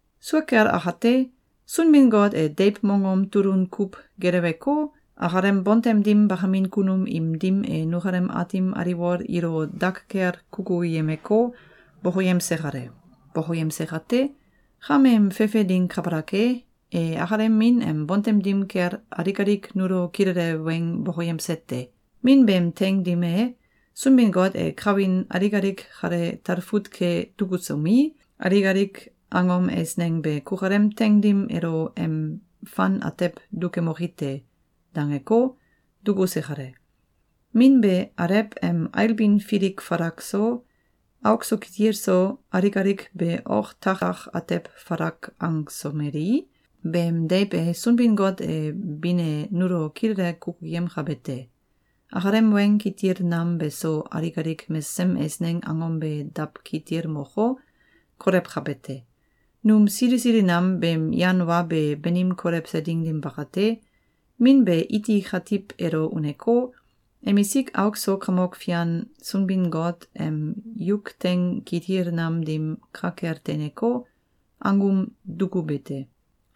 Sua kel akate, Sunbin-Got e deiw mongom tulun kuw geleweko, akalem bontem dim bakamin kunum im dim e nukalem aatim aliwol ilo dak kel kukuyemeko, bokoyemse kale. Bokoyemse kate, kameem fefe ding kabalak e, e akalem Min em bontem dim kel alik alik nulo kilele weng bokoyemse te. Min beem teing dim e, Sunbin-Got e kawin alik alik kale talfut ke dukusomi, alik alik angom eisneng be “Kukalem teing dim elo em fan atew dukemoki te!”, dangeko, dukuse kale. Min be Alew em ailbin filik falak so, auk so kitil so, alik alik be ok takak atew falak angsomelei, beem deiw e Sunbin-Got em bin e nulo kilele kukuyemkabe te. Akalem weng kitil nam beso alik alik mesesem eisneng angom be dawkitilmoko, kolewkabe te. Num sili sili nam beem yan wa be banim kolewse ding dim bakate, Min be iti katiw elo uneko, emisik auk so Kamok Fian Sunbin-Got em yuk teing kitil nam dim ka kel teineko, angum dukube te.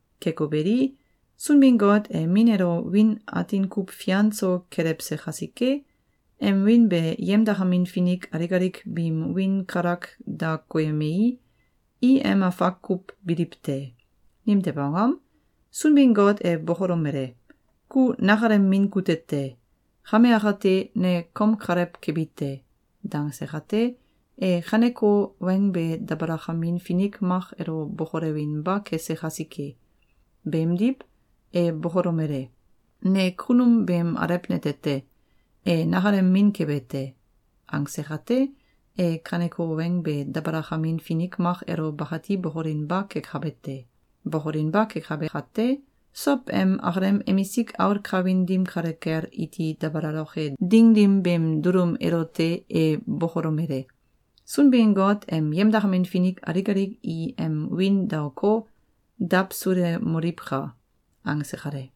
Keko beli, Sunbin-Got e Min elo wiin atin kuw fian so kelewse kasike, em wiin be yemdakamin finik alik alik biim wiin kalak da koyemei, i em afak kuw biliw te. Nimtew angom? Sunbin-Got e bokolomele: “Ku nakalem Min kute te! Kame akate, ne kom kalew kebi te!”, dangse kate, e kaneko weng be dabalakamin finik mak elo bokolewinba kese kasike. Beemdiw, e bokolomele: “Ne kunum beem alew nete te. E nakalem min kebe te!”, angse kate, e kaneko weng be dabalakamin finik mak elo bakati bokolinba kekabe te. Bokolinba kekabe kate, sow em akalem emisik aul kawin dim kale kel iti dabalaloke ding dim beem dulum elote e bokolomele: “Sunbin-Got em yemdakamin finik alik alik i em wiin daoko, dawsulemoliwka!”, angse kale.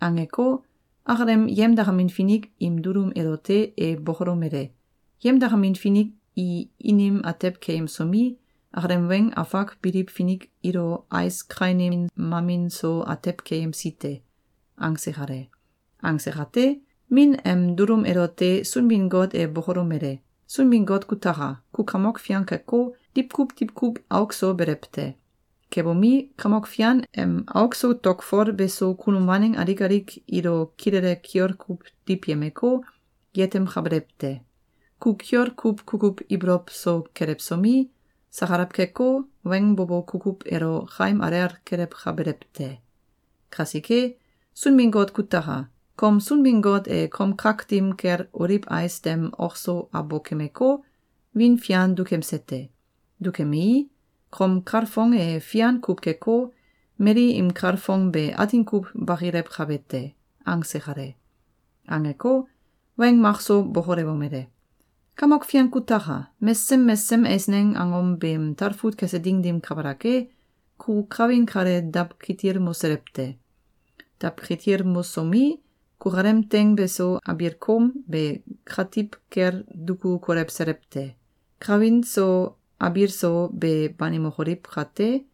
Angeko, akalem yemdakamin finik im dulum elote e bokolomele: “Yemdakamin finik i inim atew keyemsomi, akalem weng afak biliw finik ilo ais kainin mamin so atew keyemsi te.”, angse kale. Angse kate, Min em dulum elote Sunbin-Got e bokolomele: “Sunbin-Got kutaka! Ku Kamok Fian keko, diwkuw diwkuw auk so belew te. Kebomi, Kamok Fian em auk so tokfol beso kunum waneng alik alik ilo kilele kiol kuw diwyemeko, yetemkabelew te. Ku kiol kuw kukuw ibolow so kelewsomi, sakalaw keko, weng bo bo kukuw elo kaim alel kelewkabelew te. Kasike, Sunbin-Got kutaka! Kom Sunbin-Got e kom kak dim kel oliw ais dem ok so abokemeko, wiin fian dukemse te. Dukemei, kom kalfong e fian kuw keko, mali im kalfong be atin kuw bakilewkabe te.”, angse kale. Angeko, weng makso bokolewomele: “Kamok Fian kutaka! Mesesem mesesem eisneng angom beem talfut kese ding dim kabalak e, ku kawin kale dawkitilmoselew te. Dawkitilmosomi, kukalem teing beso abiil koom be katiw kel duku kolewselew te. Kawin so abiil so be banimokoliw kate,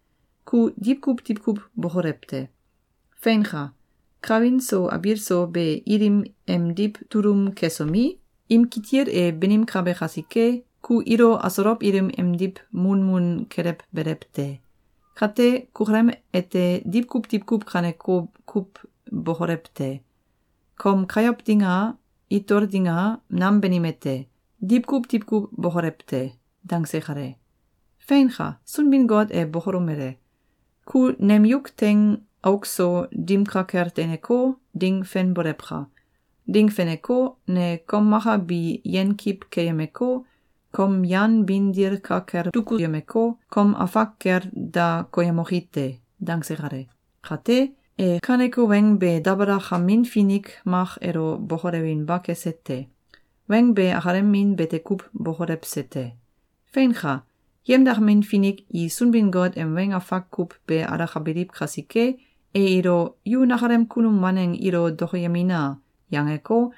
ku diwkuw diwkuw bokolew te. Feinka! Kawin so abiil so be ilim emdiw tulum kesomi, im kitil e banimkabe kasike, ku ilo asolow ilim emdiw munmun kelewbelew te. Kate, kukalem ete diwkuw diwkuw kaneko kuw bokolew te. Kom kayow ding a, itol ding a, nam banime te. Diwkuw diwkuw bokolew te.”, dangse kale. Feinka! Sunbin-Got e bokolomele: “Ku nem yuk teing auk so dim ka kel teineko, ding fenbolewka! Ding feneko, ne kom maka bi yenkiw keyemeko, kom yan bin dil ka kel dukuyemeko, kom afak kel da koyemoki te.”, dangse kale. Kate, e kaneko weng be dabalakamin finik mak elo bokolewinba kese te. Weng be akalem Min bete kuw bokolewse te. Feinka! Yemdakamin finik i Sunbin-Got em weng afak kuw ke alakabiliw kasike, e ilo “Yu nakalem kunum waneng ilo dokoyemina!”, yangeko,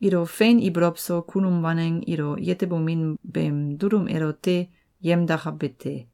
ilo fein ibolow so kunum waneng ilo yetebomin beem dulum elote yemdakabe te.